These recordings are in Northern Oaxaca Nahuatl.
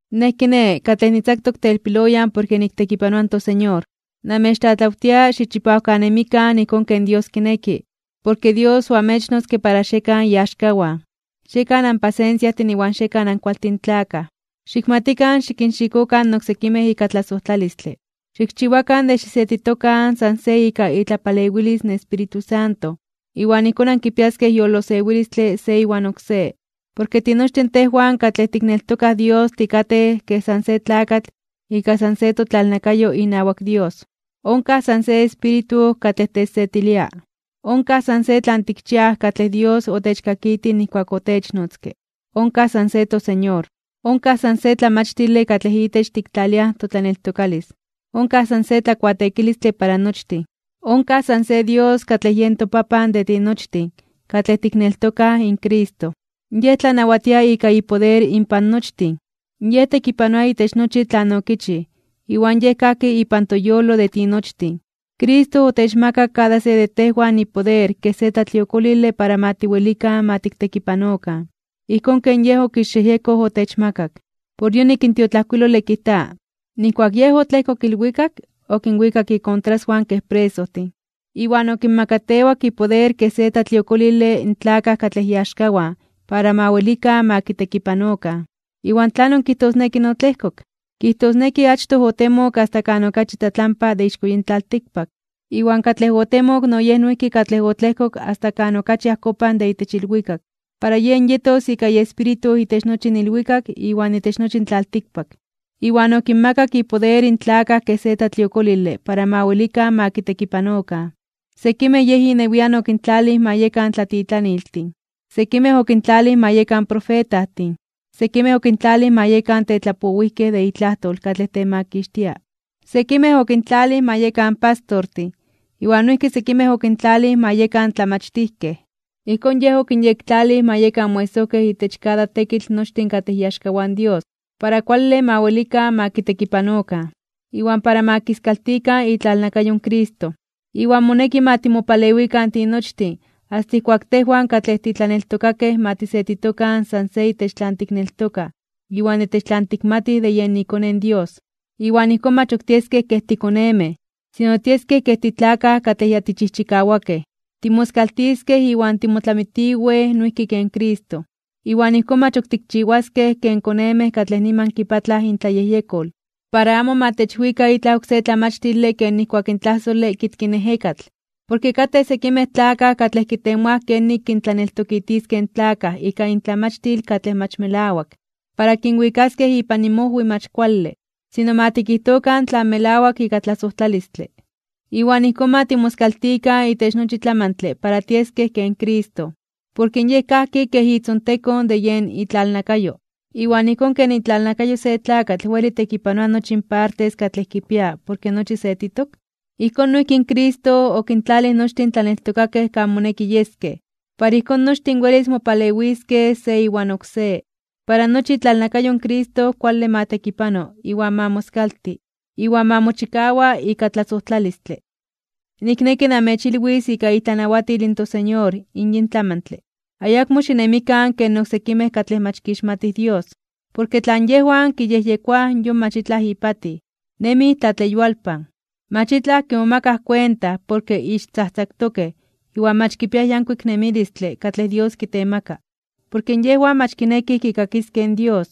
Nej, kiné, katlej nitzaktok telpiloyan porke niktekipanoa in toSeñor, namechtlatlawtia xichipawkanemikan ijkón ken Dios kineki, porke Dios oamechnotzke para xiekan iaxkawan. Xiekan anpasensiajtin iwan xiekan ankualtin tlakaj. Xikmatikan xikinxikokan oksekimej ika tlasojtlalistle. Xikchiwakan de xisetitokan san se ika itlapalewilis in Espíritu Santo. Iwan ijkón ankipiaskej yolosewilistle se iwan oksé. Porke tinochtin tejwan katlej tikneltokaj in Dios tikatej kej san se tlakatl ika san se totlalnakayo inawak Dios. Onkaj san se Espíritu katlej techsetilia. Onkaj san se tlan tikchiaj katlej Dios otechkakitij nijkuak otechnotzke. Onkaj san se toSeñor. Onkaj san se tlamachtile katlej itech tiktlaliaj totlaneltokalis. Onkaj san se tlakuateekilistle para nochtin. Onkaj san se Dios katlej yen toPapan de tinochtin katlej tikneltokaj in Cristo. Yen tlanawatia ika ipoder inpan nochtin, yen tekipanoa itech nochi tlan okichij, iwan yen kajki ipan toyolo de tinochtin. Cristo otechmakak kada se de tejwan ipoder kej se tlatliokolile para ma tiwelikan ma tiktekipanokan, ijkón ken Yej okixyejyekoj otechmakak. Por yonik in tiotlajkuilole kijta: Nijkuak Yej otlejkok ilwikak, okinwikak ikontraswan kej presojtin, iwan okinmakatewak ipoder kej se tlatliokolile in tlakaj katlej iaxkawan para ma welikan ma kitekipanokan. ¿Iwan tlanon kijtosneki “otlejkok”? Kijtosneki achtoj otemok asta kan okachi tlatlampa de ixko yin tlaltikpak. Iwan katlej otemok no yen noijki katlej otlejkok asta kan okachi ajkopan de itech ilwikak, para yen yetos ika iEspíritu itech nochi in ilwikak iwan itech nochi in tlaltikpak. Iwan okinmakak ipoder in tlakaj kej se tlatliokolile para ma welikan ma kitekipanokan. Sekimej Yej inewian okintlalij ma yekan tlatitlaniltin, sekimej okintlalij ma yekan profetajtin, sekimej okintlalij ma yekan tetlapowijkej de itlajtol katlej temakixtia, sekimej okintlalij ma yekan pastortin iwan noijki sekimej okintlalij ma yekan tlamachtijkej. Ijkón Yej okinyektlalij ma yekan moesojkej itech kada tekitl nochtin katlej iaxkawan in Dios para kuale ma welikan ma kitekipanokan, iwan para ma kiskaltikan itlalnakayo in Cristo. Iwan moneki ma timopalewikan tinochtin asta ijkuak tejwan katlej titlaneltokakej ma tisetitokan san se itech tlan tikneltokaj iwan itech tlan tikmatij de yen iKone in Dios. Iwan ijkón mach ok tieskej kej tikonemej, sino tieskej kej titlakaj katlej ya tichijchikawakej, timoskaltiskej iwan timotlamitiwej noijki ken Cristo. Iwan ijkón mach ok tikchiwaskej ken konemej katlej niman kipatlaj intlayejyekol, para amo ma techwika itlaj oksé tlamachtile ken nijkuak in tlajsole kitki in ejekatl. Porke katej sekimej tlakaj katlej kitemoaj kenik kintlaneltokitiskej in tlakaj ika intlamachtil katlej mach melawak, para kinwikaskej ipan inmojwi mach kuale. Sino ma tikijtokan tlan melawak ika tlasojtlalistle. Iwan ijkón ma timoskaltikan itech nochi tlamantle para tieskej ken Cristo, porke Yej kajki kej itzontekon de yen itlalnakayo. Iwan ijkón ken itlalnakayo se tlakatl weli tekipanoa nochi in partes katlej kipia porke nochi setitok, ijkón noijki in Cristo okintlalij nochtin tlaneltokakej kan moneki yeskej, para ijkón nochtin welis mopalewiskej se iwan oksé, para nochi itlalnakayo in Cristo kuale ma tekipano iwan ma moskalti, iwan ma mochikawa ika tlasojtlalistle. Nikneki namechilwis ika itlanawatil in toSeñor in yin tlamantle: ayakmo xinemikan ken oksekimej katlej mach kixmatij Dios. Porke tlan yejwan kiyejyekoaj yon mach itlaj ipatij. Nemij tlatleyualpan. Mach itlaj kimomakaj kuenta porke ixtzajtzaktokej iwan mach kipiaj yankuik nemilistle katlej Dios kitemaka. Porke yejwan mach kinekij kikakiskej in Dios.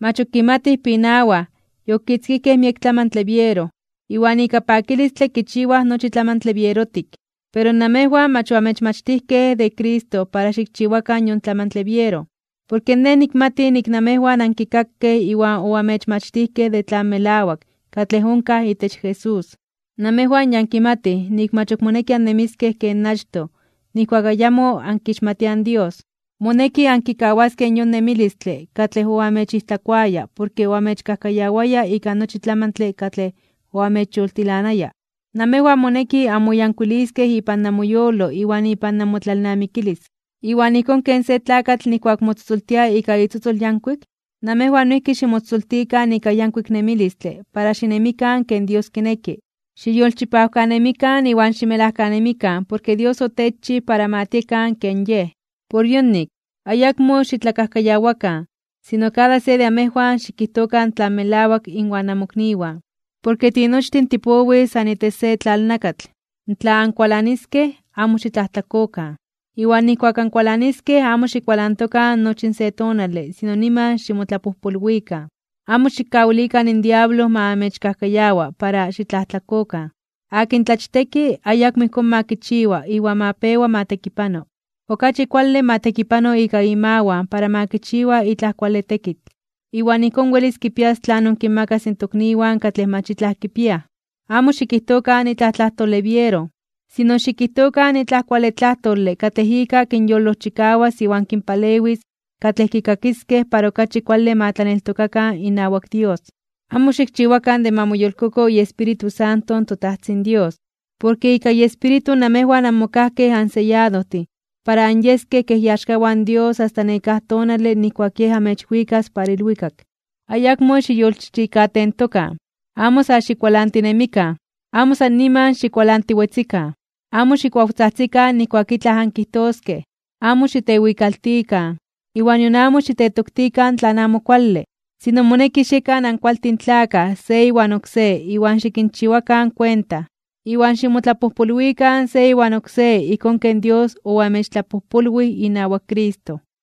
Mach ok kimatij pinawaj, yokitzkijkej miek tlamantle biero, iwan ika pakilistle kichiwaj nochi tlamantle bierotik. Pero namejwan mach oamechmachtijkej de Cristo para xikchiwakan yon tlamantle biero, porke nej nikmati nik namejwan ankikakej iwan oamechmachtijkej de tlan melawak katlej onkaj itech Jesús. Namejwan ya ankimatij nik mach ok moneki annemiskej ken achtoj nijkuak ayamo ankixmatiaj in Dios. Moneki ankikawaskej yon nemilistle katlej oamechijtlakoaya porke oamechkajkayawaya ika nochi tlamantle katlej oamechyoltilanaya. Namejwan moneki anmoyankuiliskej ipan namoyolo iwan ipan namotlalnamikilis. Iwan ijkón ken se tlakatl nijkuak motzotzoltia ika itzotzol yankuik, namejwan noijki ximotzotzoltikan ika yankuik nemilistle para xinemikan ken Dios kineki. Xiyolchipawkanemikan iwan ximelajkanemikan porke Dios otechchij para ma tiekan ken Yej. Por yonik, ayakmo xitlakajkayawakan, sino kada se de amejwan xikijtokan tlan melawak inwan namokniwan. Porke tinochtin tipowij san itech se tlalnakatl. Tla ankualaniskej, amo xitlajtlakokan. Iwan nijkuak ankualaniskej amo xikualantokan nochi in se tonale sino niman ximotlapojpolwikan. Amo xikkawilikan in diablo ma amechkajkayawa para xitlajtlakokan. Akin tlachteki, ayakmo ijkón ma kichiwa iwan ma pewa ma tekipano. Okachi kuale ma tekipano ika imawan para ma kichiwa itlaj kuale tekitl, para ijkón welis kipias tlanon kinmakas in tokniwan katlej mach itlaj kipiaj. Amo xikijtokan itlaj tlajtole biero, sino xikijtokan itlaj kuale tlajtole katlej ika kinyolojchikawas iwan kinpalewis katlej kikakiskej para okachi kuale ma tlaneltokakan inawak Dios. Amo xikchiwakan de ma moyolkoko iEspíritu Santo in toTajtzin Dios, porke ika iEspíritu namejwan anmokajkej anseyadojtin (onmachiotitokej) para anyeskej kej iaxkawan in Dios asta nekáj tonale nijkuak Yej amechwikas para ilwikak. Ayakmo xiyolchichikatentokan, amo sa xikualantinemikan, amo san niman xikualantiwetzikan, amo xikuawtzajtzikan nijkuak itlaj ankijtoskej, amo xitewikaltikan, iwan nion amo xitetoktikan tlan amo kuale. Sino moneki xiekan ankualtin tlakaj se iwan oksé iwan xikinchiwakan kuenta, iwan ximotlapojpolwikan se iwan oksé ijkón ken Dios oamechtlapojpolwij inawak Cristo.